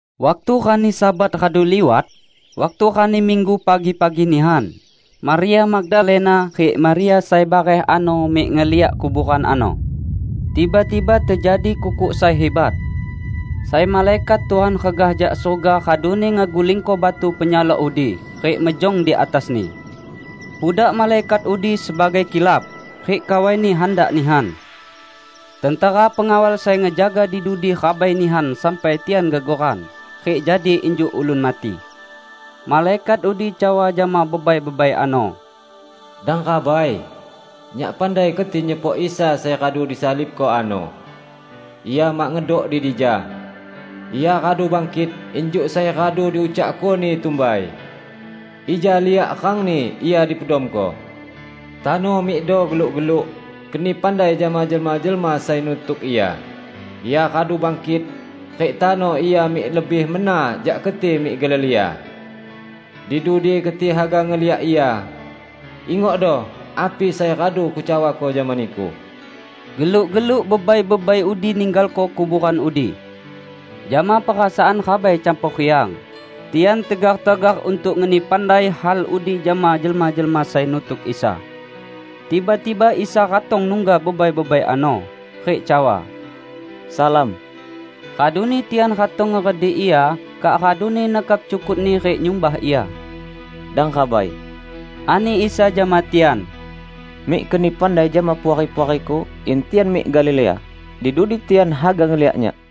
Waktu rani Sabat radu liwat, waktu rani Minggu pagi-pagi nihan, Maria Magdalena rik Maria sai bareh ano mik ngeliak kuboran ano. Tiba-tiba tejadi kukuk sai hibat. Sai malaikat Tuhan regah jak surga raduni ngegulingko batu penyalok udi, rik mejong di atasni. Pudak malaikat udi sebagai kilap, rik kawaini handak nihan. Tentera pengawal sai ngejaga di dudi rabai nihan sampai tian gegoran, rik jadi injuk ulun mati. Malaikat udi cawa jama bebai-bebai ano, "Dang rabai! Nyak pandai keti nyepok Isa sai radu disalibko ano. Ia mak ngedok di dija. Ia radu bangkit injuk sai radu diucakko-Ni tumbai. Ija liak rangni Ia dipedamko. Tano, mikdo geluk-geluk, keni pandai jama jelma-jelma sai nutuk Ia, 'Ia radu bangkit, rik tano Ia mik lebih mena jak keti mik Galilea. Di dudi keti haga ngeliak Ia!' Ingokdo api sai radu kucawako jama niku." Geluk-geluk bebai-bebai udi ninggalko kuboran udi. Jama perasaan rabai campor riang, tian tegar-tegar untuk ngeni pandai hal udi jama jelma-jelma sai nutuk Isa. Tiba-tiba Isa ratong nungga bebai-bebai ano, rik cawa, "Salam!" Raduni tian ratong ngeredik Ia, kak raduni nekap cukut-Ni rik nyumbah Ia. "Dang rabai," ani Isa jama tian, "mik keni pandai jama puari-puari-Ku in tian mik Galilea; di dudi tian haga ngeliak Nyak."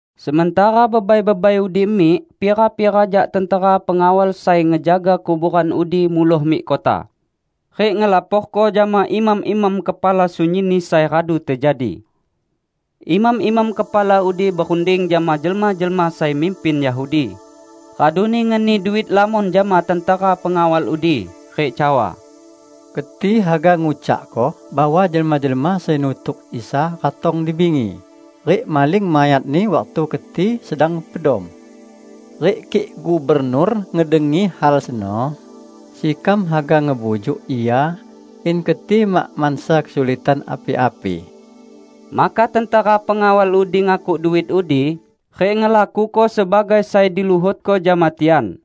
Sementara bebai-bebai udi mik, pira-pira jak tentera pengawal sai ngejaga kuboran udi muloh mik kota, rik ngelaporko jama imam-imam kepala sunyinni sai radu tejadi. Imam-imam kepala udi berunding jama jelma-jelma sai mimpin Yahudi, raduni ngeni duit lamon jama tentera pengawal udi, rik cawa, "Keti haga ngucakko bahwa jelma-jelma sai nutuk Isa ratong di bingi, rik maling mayat-Ni waktu keti sedang pedom. Rik kik gubernur ngedengi hal seno, sekam haga ngebujuk ia in keti mak mansa kesulitan api-api." Maka tentera pengawal udi ngakuk duit udi, rik ngelakuko sebagai sai diluhotko jama tian.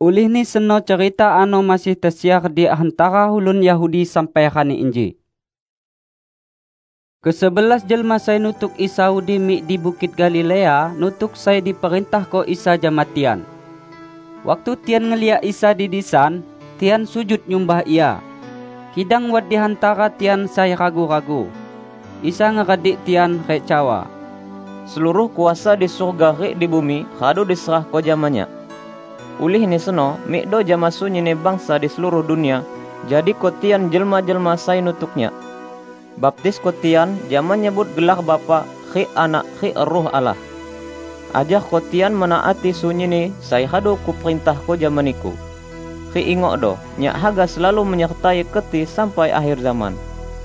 Ulihni seno cerita ano masih tesiar di hantara ulun Yahudi sampai rani inji. Kesebelas jelma sai nutuk Isa udi mik di Bukit Galilea nutuk sai diperintahko Isa jama tian. Waktu tian ngeliak Isa di disan, tian sujud nyumbah Ia. Kidang wat di hantara tian sai ragu-ragu. Isa ngeredik tian, rik cawa, "Seluruh kuasa di surga rik di bumi radu diserahko jama Nyak. Ulihni seno mikdo jama sunyinni bangsa di seluruh dunia, jadiko tian jelma-jelma sai nutuk Nyak. Baptisko tian jama nyebut gelar Bapa, rik Anak, rik Ruh Allah. Ajarko tian menaati sunyinni sai radu Kuperintahko jama niku. Rik ingokdo Nyak haga selalu menyertai keti sampai akher zaman."